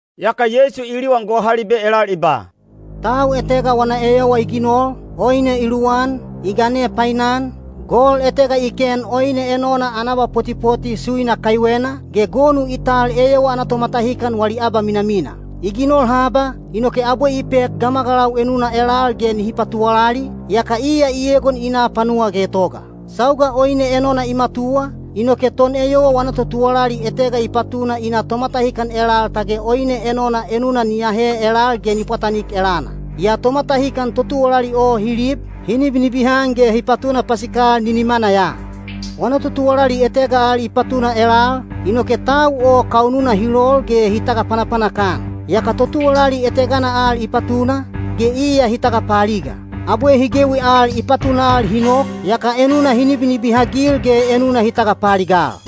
Yaka Yeisu i liwan gohalibe elal i ba, “Tau etega wana eyowa i ginol, oine i luwan, i gane painan, gol etega i ken oine enona ana abapotipoti suina kaiwena, ge gonu i tal eyowa ana tomatahikan wali abaminamina. I ginol haba, inoke abwe i pek gamagalau enuna elal ge nihi patuwalali, yaka iya i egon i na panuwa getoga. Sauga oine enona i matuwa, inoke toneyowa wana totuwalali etega i patuna i na tomatahikan elal tage oine enona enuna ni ahe elal ge ni pwatanik elana. Yaa tomatahikan totuwalali o hi lib, hi nibinibihan ge hi patuna pasikal ninimana ya. Wana totuwalali etega al i patuna elal, inoke tau o kaununa hi lol ge hi tagapanapanak-an. Yaka totuwalali etegana al i patuna, ge iya hi tagapaaliga. Abwe hi gewi al i patunal hi nok, yaka enuna hi nibinibihagil ge enuna hi tagapaaligal.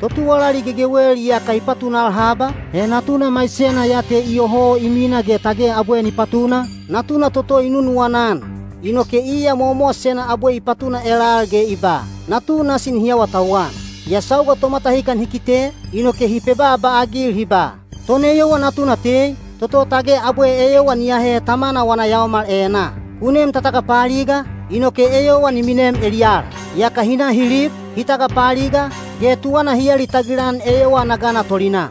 “Totuwalali gegewel iyaka i patunal haba, he natuna maisena ya te iyoho i mina ge tage abwe ni patuna, natuna toto i nunuwana-an. Inoke iya mowamowasena abwe i patuna elal ge i ba, ‘Natu nasi nihi awatauwan.’ “Yaa sauga tomatahikan hi kite, inoke hi pebaaba-agil hi ba, ‘Toneyowa natuna te, toto tage abwe eyowa ni ahe tamana wana yaomal enaa. Ku nem ta tagapaaliga, inoke eyowa ni minem eliyala.’ Yaka hi na hi lib, hi tagapaaliga, ge tuwana hi alitagil-an eyowa ana gana tolinaa.”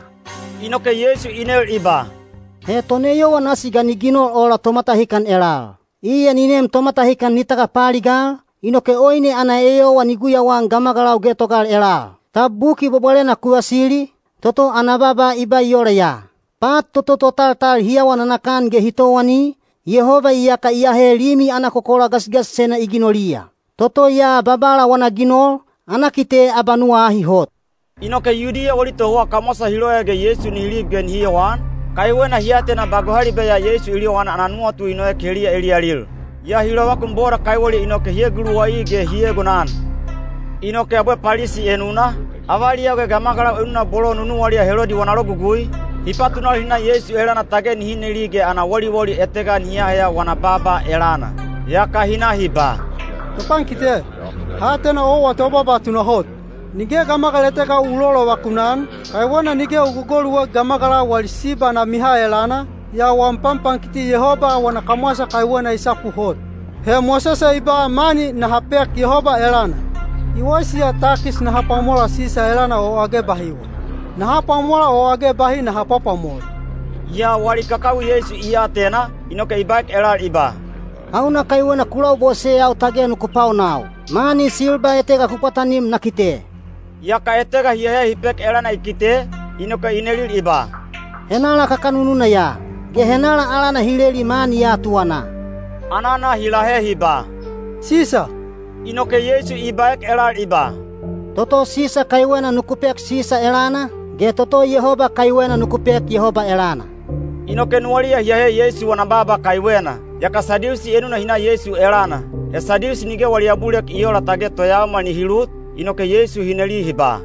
Inoke Yeisu i nel i ba, “He toneyowa nasi ga ni ginol ola tomatahikan elal? Iya ni nem tomatahikan ni tagapaaligal, inoke oine ana eyowa ni guyauan gamagalau getogal elal. Tab Buki Bwabwalena ku vasili, toto ana baaba i ba ola ya: ‘Pat toto totaltal hi awa nanakan ge hi towani, Yehoba iyaka i ahe limi ana kokola gasigasisena i ginoliya. Toto ya Babala wana ginol, ana kite abanuwa ahi hot.’” Inoke Yudiya wali tohouwa kamwasa hi loya ge Yeisu nihi lib ge nihi yowan, kaiwena hi atena ba gohalibe ya Yeisu i liwanan ana nuwatu i noek heliya eliyalil. Yaa hi lovakun boda kaiweliya inoke hi eguluwai ge hi egonan. Inoke abwe Palisi enuna, avaliyau ge gamagalau enuna bolo nunuwaliya Helodi wana logugui, hi patunal hi na Yeisu elana tage nihi neli ge ana woliwoli etega nihi aheya wana baaba elana. Yaka hi na hi ba, “Topankite, ha atena owa tobaaba tunahot. Nige gamagal etega u lolovakun-an, kaiwena nige u gogoluek gamagalau wali siba ana miha elana, yaa wam panpankiti Yehoba wana kamwasa kaiwena i sapu hot. He Mosese i ba mani naha pek Yehoba elana. I waisi ya takis naha pwamola Sisa elana o age bahiwa? Naha pwamola o age bahi naha pwapwamola?” Yaa wali kakawi Yeisu i atena, inoke i baek elal i ba, “Hauna kaiwena ku laboseyau tage nuku paonau? Mani silba etega ku pwatanim na kite.” Yaka etega hi ahe hi pek elana i kite, inoke i nelil i ba, “Henala kakanununa ya? Ge henala alana hi leli mani ya tuwanaa?” Anana hi lahe hi ba, “Sisa.” Inoke Yeisu i baek elal i ba, “Toto Sisa kaiwena nuku pek Sisa elana, ge toto Yehoba kaiwena nuku pek Yehoba elana.” Inoke nuwaliya hi ahe Yeisu wana baaba kaiwena. Yaka Sadiusi enuna hi na Yeisu elana. He Sadiusi nige wali abulilek i oola tage toyaomal nihi lut, inoke Yeisu hi neli hi ba,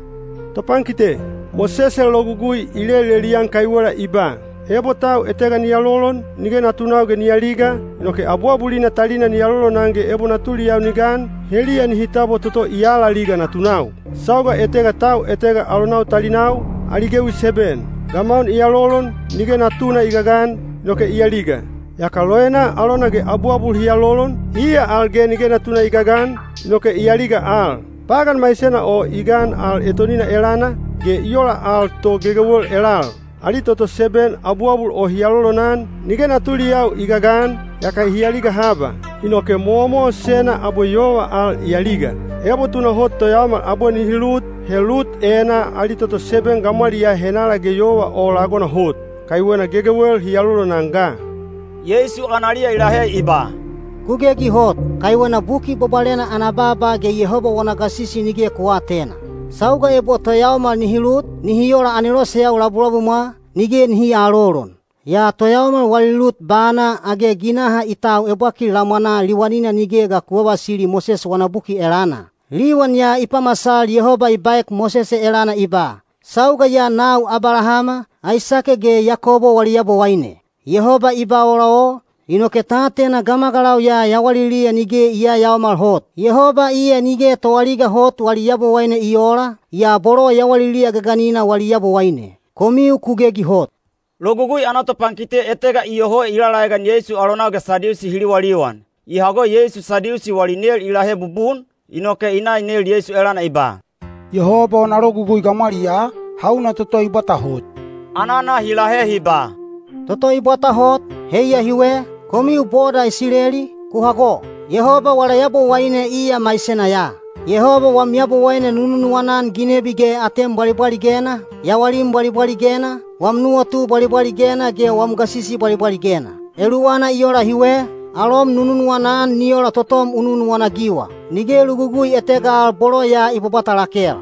“Topankite, Mosese logugui i lelelian kaiwela i ba, ‘Ebo tau etega ni alolon, nige natunau ge ni aliga, inoke abuabulina talina ni alolonan ge ebo natuliyau ni gan, heliya nihi tabwa toto i alaliga natunau.’ Sauga etega tau etega alonau talinau, ali gewi seben. Gamaun i alolon, nige natuna i gagan, inoke i aliga. Yaka loenaa alona ge abuabul hi alolon, iya al ge nige natuna i gagan, inoke i aliga al. Pagan maisena o i gan al etonina elana, ge i ola ya to gegewel elal. Ali toto seben abuabul o hi alolonan, nige natuliyau i gagan, yaka hi aliga haba. Inoke mowamowasena abwe yova al i aliga. Ebo tunahot toyaomal abwe nihi lut, he lut enaa ali toto seben gamwaliyaa henala ge yova o lagona hot? Kaiwena gegewel hi alolonan ga.” Yeisu analiya i lahe i ba, “Ku gegi hot, kaiwena Buki Bwabwalena ana baaba ge Yehoba wana gasisi nige ku aatena. Sauga ebo toyaomal nihi lut, nihi ola aneloseyau labulabumwa, nige nihi aalolon. Yaa toyaomal wali lut bana—age ginaha i tau ebwakil lamwanaa liwanina nige ga ku vavasili Mosese wana buki elana? Liwan ya i pamasal Yehoba i baek Mosese elana i ba, ‘Sauga ya nau Abalahama, Aisake ge Yakobo wali Yabowaine.’ Yehoba i ba ola o, inoke ta atena gamagalau ya yawaliliya nige i yayaomal hot. Yehoba iya nige toaliga hot wali Yabowaine i oola, yaa bolo yawaliliya gaganina wali Yabowaine. Komiu ku gegi hot.” Logugui ana topankite etega iyoho i lalaegan Yeisu alonau ge Sadiusi hi liwaliwan. I hago Yeisu Sadiusi wali nel i lahe bubun, inoke i na i nel Yeisu elana i ba, “Yehoba wana logugui gamwaliyaa, hauna toto i bwata hot?” Anana i lahe i ba, “Toto i bwata hot, heiya hiwe, ‘Komiu boda Isileli, ku hago! Yehoba wala Yabowaine iya maisena ya. Yehoba wam Yabowaine nu nunuwana-an ginebi ge atem bwalibwaligena, yawalim bwalibwaligena, wam nuwatu bwalibwaligena ge wam gasisi bwalibwaligena.’ Eluwana i ola hiwe, ‘Alom nu nunuwana-an ni ola totom u nunuwana-agiwa.’ Nige logugui etega al bolo ya i bwabwata lakel.”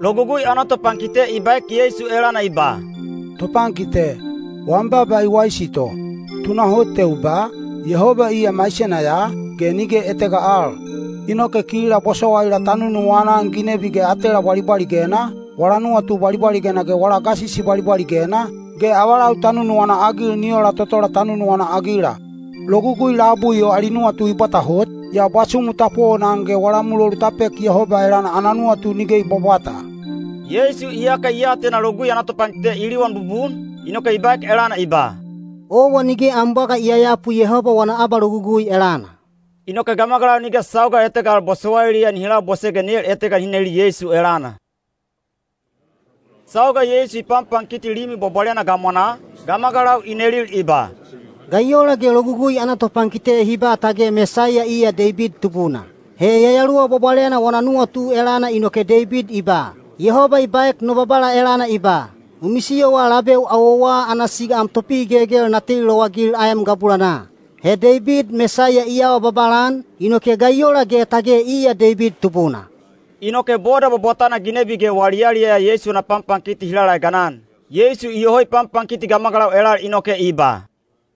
Logugui ana topankite i baek Yeisu elana i ba, “Topankite, wam baaba i waisi to. Tunahot te u ba, ‘Yehoba iya maisena ya, ge nige etega al.’ Inoke kila bosowaila ta nunuwana-an ginebi ge atela bwalibwaligena, wala nuwatu bwalibwaligena ge wala gasisi bwalibwaligena, ge avalau ta nunuwana-agil ni ola totola ta nunuwana-agila. Logugui labui o ali nuwatu i bwata hot, yaa bwasumu ta powonan ge wala mulolu ta pek Yehoba elana ana nuwatu nige i bwabwata.” Yeisu iyaka i atena Logugui ana topankite i liwan bubun, inoke i baek elana i ba, “Owa nige am bwaga i yayapu Yehoba wana abalogugui elana.” Inoke gamagalau nige sauga etega al bosowailiya nihi labose ge nel etega nihi neli Yeisu elana. Sauga Yeisu i panpankiti Limi Bwabwalena gamwanaa, gamagalau i nelil i ba, “Ga i ola ge Logugui ana topankite hi ba tage Mesaiya iya Deibid tubuna? He Yayaluwa Bwabwalena wana nuwatu elana inoke Deibid i ba, ‘Yehoba i baek no Babala elana i ba: U misiyowa labeu awowa ana siga am topihigelgel na teli lowagil aem gabulanaa!’ He Deibid Mesaiya i awa babala-an, inoke ga i ola ge tage iya Deibid tubuna?” Inoke boda bwabwatana ginebi ge wali yaliyaya Yeisu wana panpankiti hi laeganan. Yeisu iyoho i panpankiti gamagalau elal inoke i ba,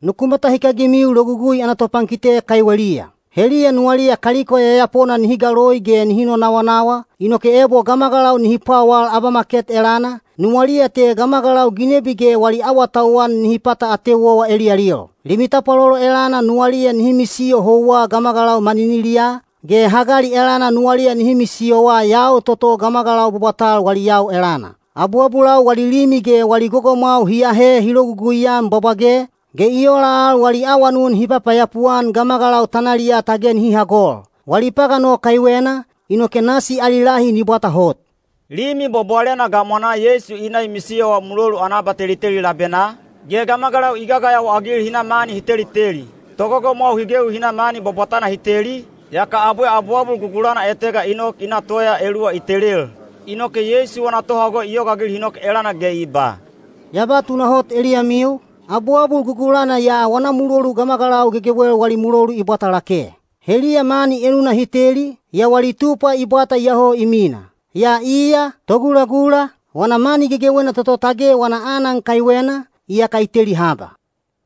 “Nuku matahikagimiu Logugui ana topankite kaiweliya. Heliya nuwaliya kaliko yayapona nihi galoi ge nihi nonawanawa, inoke ebo gamagalau nihi pwawal abamaket elana, nuwaliya te gamagalau ginebi ge wali awatauwan nihi pata ateu owa eliyalil. Limi tapwalolo elana nuwaliya nihi misiyo houwa gamagalau maniniliyaa, ge hagali elana nuwaliya nihi misiyowa yau toto gamagalau bwabwatal wali yau elana. Abuabulau wali limi ge wali gogomwau hi aahe hi lologugui-an bwabwage, ge i ola al wali awanun hi papayapu-an gamagalau tanaliyaa tage nihi hagol. Wali pagan o kaiwena, inoke nasi ali lahi ni bwata hot.” Limi Bwabwalena gamwanaa Yeisu i na i misiyowa mulolu ana abateliteli labenaa, ge gamagalau i gagayawa-agil hi na mani hi teliteli. Togogomwau hi gewi hi na mani bwabwatana hi teli, yaka abwe abuabul gugulana etega i nok i na toya eluwa i telel. Inoke Yeisu wana tohago i yogaagil hi nok elana ge i ba, “Ya ba tunahot eliyamiu, abuabul gugulana ya wana mulolu gamagalau gegewel wali mulolu i bwata lake. Heliya mani enuna hi teli, yaa wali tupwa i bwata iyoho i mina. Yaa iya, togulagula, wana mani gegewena toto tage wana aanan kaiwena, iyaka i teli haba.”